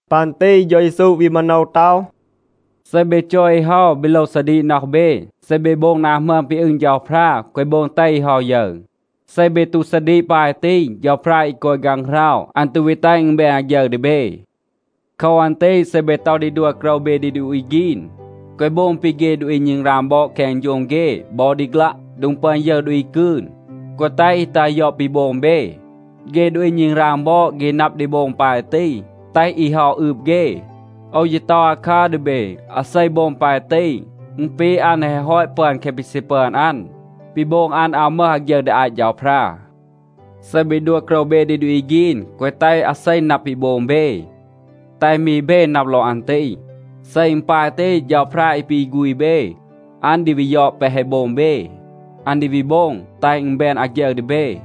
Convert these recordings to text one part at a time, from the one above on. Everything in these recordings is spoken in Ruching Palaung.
ปัน ตี เฌา เยซู วี มาโนว ต็อห, “เซ เบ จอย อี เฮา, เบ โลว ซาดีก น็อห เบ. เซ เบ โบง นา หมึอม ปี อึง เฌาพรา, แกวะ โบง แตห อี เฮา ยึร. เซ เบ ตู ซาดีก ปาย ตี, เฌาพรา อี กอย ฆางหราว, อัน ตู วี แตห อึณ แบน อาฆยึร ดี เบ. โคว อัน ตี เซ เบ ต็อห ดี ดัว โกรว เบ ดี ดูอี ฆีน, แกวะ โบง ปี เฆ ดูอี ณึงราง บอด แคง โฌง เฆ บอ ดี ฆลัะ โดง ปึอน ยึร ดูอี กืน. แกวะ แดะ อี ตัห ยอด ปี โบง เบ. เฆ ดูอี ณึงราง บอด, เฆ นับ ดี โบง ปาย ตี, แตห อี เฮา อืบ เฆ. โอว ยี ต็อห อาคัร ดี เบ. อาเซ โบง ปาย ตี, อึณ ปี อัน แฮะ ฮอต ปึอน แคะ ปี ซี ปึอน อัน. ปี โบง อัน อาว มึห อาฆยึร ดี อาต เฌาพรา. เซ เบ ดัว โกรว เบ ดี ดูอี ฆีน, แกวะ แตห อาเซ นับ ปี โบง เบ. แตห มี เบ นับ ลอง อัน ตี. เซ อึณ ปาย ตี, เฌาพรา อี ปี ฆูณ เบ, อัน ดี วี ยอด แปะ แฮะ โบง เบ. อัน ดี วี โบง, แตห อึณ แบน อาฆยึร ดี เบ.”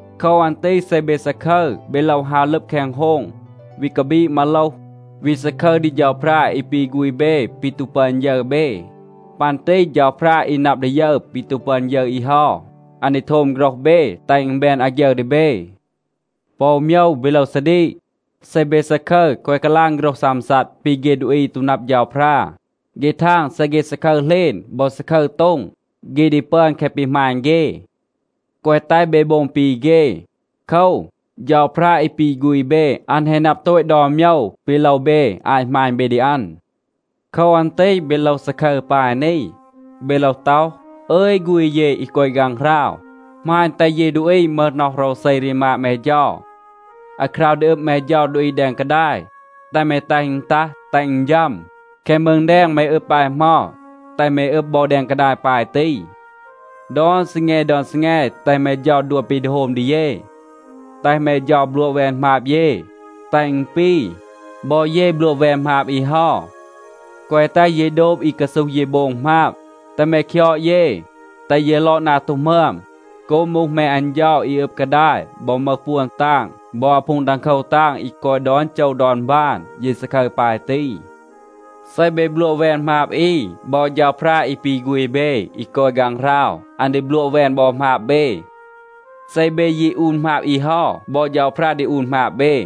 โคว อัน ตี เซ เบ ซาคึร, เบ โลว ฮาว ลึบ แคง โฮง, วี กาบีด มาโลห, วี ซาคึร ดี เฌาพรา อี ปี ฆูณ เบ ปี ตู ปึอน ยึร เบ. ปัน ตี เฌาพรา อี นับ ดี ยึร ปี ตู ปึอน ยึร อี เฮา, อัน ดี โทม โฆรห เบ, แตห อึณ แบน อาฆยึร ดี เบ. ปอ อู โมยว เบ โลว ซาดีก. เซ เบ ซาคึร, แกวะ กาลาง โฆรห ซัมซัด ปี เฆ ดูอี อี ตู นับ เฌาพรา. เฆ ทาง, เซ เฆ ซาคึร เหลณ บอ ซาคึร โต็ง, เฆ ดี ปึอน แคะ ปี หมาณ เฆ. แกวะ แตห เบ โบง ปี เฆ. โคว, เฌาพรา อี ปี ฆูณ เบ, อัน แฮะ นับ โตต ดอน โมยว ปี โลว เบ อาต หมาณ เบ ดี อัน. โคว อัน ตี เบ โลว ซาคึร ปาย นี. เบ โลว ต็อห, ‘อึย, ฆูณ เย อี กอย ฆางหราว, หมาณ แตห เย ดูอี มึห น็อห โรวเซ รีมาด แม เฌา. อาคราว ดี อึบ แม เฌา ดูอี แดง กาดาย, แตห แม แตห อึณ ตัห, แตห อึณ ฌัม. แคง มืง แดง แม อึบ ปาย เหมา, แตห แม อึบ บอ แดง กาดาย ปาย ตี. ดอน ซีแง ดอน ซีแง แตห แม เฌา ดัว ปี ดี โฮม ดี เย. แตห แม เฌา บลัวะ แวน หมาบ เย. แตห อึณ ปี, บอ เย บลัวะ แวน หมาบ อี เฮา. แกวะ แตห เย โดบ อี กาซูห เย โบง หมาบ. แตห แม คยอด เย, แตห เย ลอด นา ตู หมึอม. โกบ มูห แม อัน เฌา อี อึบ กาดาย บอ มึห ปวน ตาง บอ อาพูง ดังโคว ตาง อี กอย ดอน โจว ดอน บาน, เย ซาคึร ปาย ตี.’a เซ เบ บลัวะ แวน หมาบ อี, บอ เฌาพรา อี ปี ฆูณ เบ, อี กอย ฆางหราว, อัน ดี บลัวะ แวน บอ หมาบ เบ. เซ เบ ยี อูน หมาบ อี เฮา, บอ เฌาพรา ดี อูน หมาบ เบ.”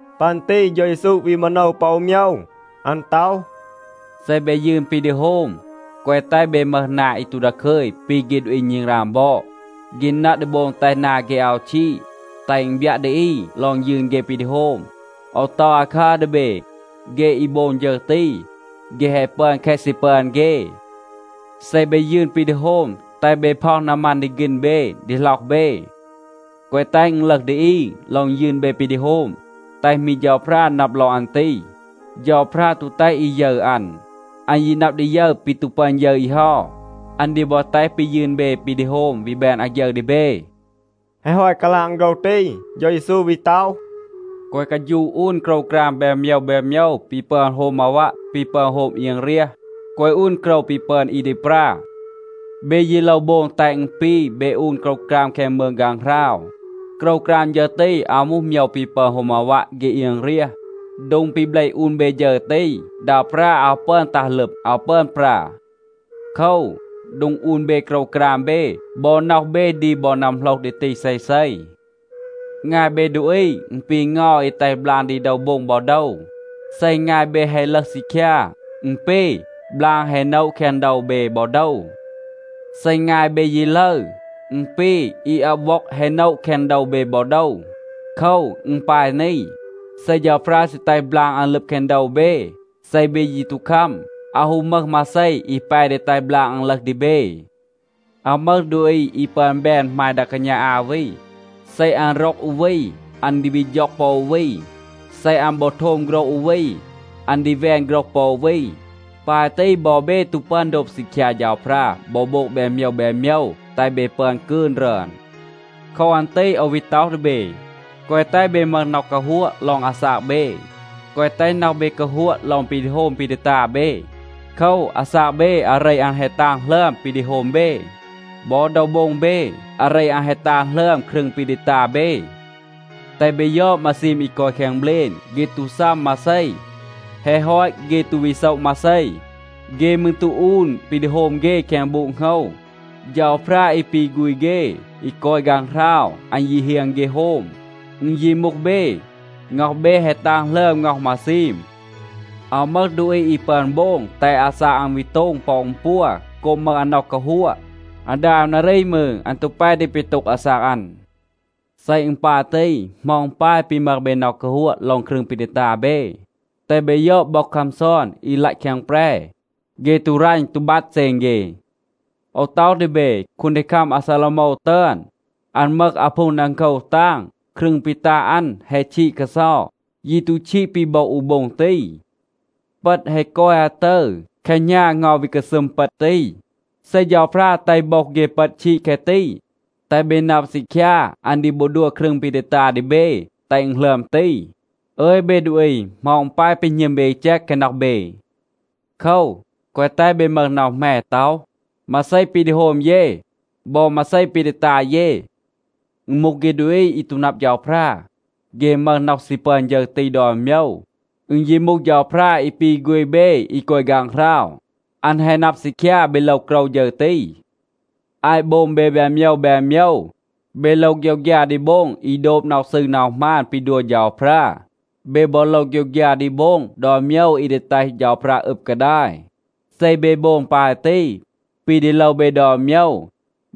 ปัน ตี เฌา เยซู วี มาโนว ปอ อู โมยว. อัน ต็อห, “เซ เบ ยืน ปี ดี โฮม, แกวะ แตห เบ มึห นา อี ตู ดาคึย ปี เฆ ดูอี ณึงราง บอด. เฆ นับ ดี โบง แตห นา เฆ อาว ชีด, แตห อึณ บยัะ ดี อี ลอง ยืน เฆ ปี ดี โฮม. โอว ต็อห อาคัร ดี เบ, เฆ อี โบง ฌึร ตี, เฆ แฮะ ปึอน แคะ ซี ปึอน เฆ. เซ เบ ยืน ปี ดี โฮม, แตห เบ พ็อห นามัน ดี ฆีณ เบ, ดีหล็อห เบ. แกวะ แตห อึณ ลึห ดี อี ลอง ยืน เบ ปี ดี โฮม. แตห มี เฌาพรา นับ ลอง อัน ตี. เฌาพรา ตู แตห อี ยึร อัน. อัน ยี นับ ดี ยึร ปี ตู ปึอน ยึร อี เฮา. อัน ดี บอ แตห ปี ยืน เบ ปี ดี โฮม วี แบน อาฆยึร ดี เบ.” แฮะ ฮอต กาลาง โฆรห ตี, เฌา เยซู วี ต็อห, “แกวะ กาฌูะ อูน โกรวกราม แบน โมยว แบน โมยว ปี ปึอน โฮม มาวัะ, ปี ปึอน โฮม เอียงเรียห. แกวะ อูน โกรว ปี ปึอน อี ดี ปรา. เบ ยี โลว โบง แตห อึณ ปี เบ อูน โกรวกราม แคง มืง ฆางหราว. โกรวกราม ฌึร ตี อาว มูห โมยว ปี ปึอน โฮม มาวัะ เฆ เอียงเรียห. โดง ปี เบลห อูน เบ ฌึร ตี, ดา ปรา อาว ปึอน ตัห ลึบ, อาว ปึอน ปรา. โคว, โดง อูน เบ โกรวกราม เบ, บอ น็อห เบ ดี บอ นัมโหลห ดี ตี เซเซ. งาย เบ ดูอี, อึณ ปี เงา อี แตห บลาง ดี โดว โบ็ง บอ โดว. เซ งาย เบ แฮะ ลึห ซีคยา, อึณ ปี, บลาง แฮะ โนะ แคง โดว เบ บอ โดว. เซ งาย เบ ยี ลึร, อึณ ปี, อี อับ ว็อง แฮะ โนะ แคง โดว เบ บอ โดว. โคว, อึณ ปาย นี. เซ เฌาพรา ซี แตห บลาง อัน ลึบ แคง โดว เบ, เซ เบ ยี ตู คัม, อาว ฮู มึห มาเซ อี แป ดี แตห บลาง อัน ลึห ดี เบ. อาว มึห ดูอี อี ปึอน แบน หมาย ดา กาณา อา วี. เซ อัน ร็อก อู วี, อัน ดี วี ฌ็อง ปอ อู วี. เซ อัน บอ โทม โฆรห อู วี, อัน ดี แวน โฆรห ปอ วี. ปาย ตี บอ เบ ตู ปึอน โดบ ซีคยา เฌาพรา บอ โบง แบน โมยว แบน โมยว แตห เบ ปึอน กืน รึอน. โคว อัน ตี โอว วี ต็อห ดี เบ, แกวะ แตห เบ มึห น็อห กาฮัวะ ลอง อาซาก เบ. แกวะ แตห น็อห เบ กาฮัวะ ลอง ปี ดี โฮม ปี ดี ตา เบ. โคว, อาซาก เบ, อาเร อัน แฮะ ตาง หลึอม ปี ดี โฮม เบ. บอ โดว โบ็ง เบ, อาเร อัน แฮะ ตาง หลึอม ครึง ปี ดี ตา เบ. แตห เบ ยอด มาซีม อี กอย แคง เบลณ. เฆ ตู ซัม มาเซ. แฮะ ฮอต, เฆ ตู วี โซะ มาเซ. เฆ มืร ตู อูน ปี ดี โฮม เฆ แคง บูะ โหงว. เฌาพรา อี ปี ฆูณ เฆ, อี กอย ฆางหราว, อัน ยี เฮียง เฆ โฮม. อึณ ยี มูห เบ, ง็อห เบ แฮะ ตาง หลึอม ง็อห มาซีม. อาว มึห ดูอี อี ปึอน โบง แตห อาซาก อัน วี โต็ง ปอ อึณ ปัว โกบ มึห อัน น็อห กาฮัวะ. อาดา อู นารี มืร อัน ตู แป ดี ปีโต็ง อาซาก อัน. เซ อึณ ปาย ตี, เหมา อึณ ปาย ปี มึห เบ น็อห กาฮัวะ ลอง ครึง ปี ดี ตา เบ? แตห เบ ยอด โบห คัมซอน อี ลัต แคง แปร. เฆ ตู รัณ, ตู บัด เซณ เฆ. โอว ต็อห ดี เบ, คูนดีคัม อาซาโลวโมว ตึอน, อัน มึห อาพูง ดังโคว ตาง. ครึง ปี ตา อัน แฮะ ชีด กาเซา, ยี ตู ชีด ปี โบห อู โบ็ง ตี. เปต แฮะ กอย อาตึร. แคหณา เงา วี กาซึม เปต ตี. เซ เฌาพรา แตห โบห เฆ เปต ชีด แคะ ตี, แตห เบ นับ ซีคยา, อัน ดี บอ ดัว ครึง ปี ดี ตา ดี เบ, แตห อึณ หลึอม ตี. อึย เบ ดูอี, เหมา อึณ ปาย ปี หณึม เบ อี แจก แคง น็อห เบ? โคว, แกวะ แตห เบ มึห น็อห แหม ต็อห, ‘มาเซ ปี ดี โฮม เย?’ บอ ‘มาเซ ปี ดี ตา เย?’ อึณ มูห เฆ ดูอี อี ตู นับ เฌาพรา, เฆ มึห น็อห ซี ปึอน ฌึร ตี ดอน โมยว. อึณ ยี มูห เฌาพรา, อี ปี ฆูณ เบ, อี กอย ฆางหราว, อัน แฮะ นับ ซีคยา, เบ โลว โกรว ฌึร ตี. อาต โบง เบ แบน โมยว แบน โมยว, เบ โลว โฆยวฆยา ดี โบง อี โดบ น็อห ซืร น็อห หมาน ปี ดัว เฌาพรา. เบ บอ โลว โฆยวฆยา ดี โบง ดอน โมยว อี ดี แตห เฌาพรา อึบ กาดาย. เซ เบ โบง ปาย ตี, ปี ดี โลว เบ ดอน โมยว,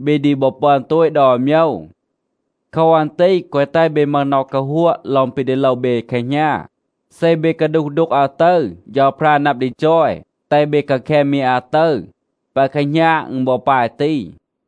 เบ ดี บอ ปึอน โตต ดอน โมยว. โคว อัน ตี แกวะ แตห เบ มึห น็อห กาฮัวะ ลอง ปี ดี โลว เบ แคหณา. เซ เบ กาดูห ดูก อาตึร, เฌาพรา นับ ดี จอย, แตห เบ กาแคณ มี อาตึร. ปา แคหณา อึณ บอ ปาย ตี.”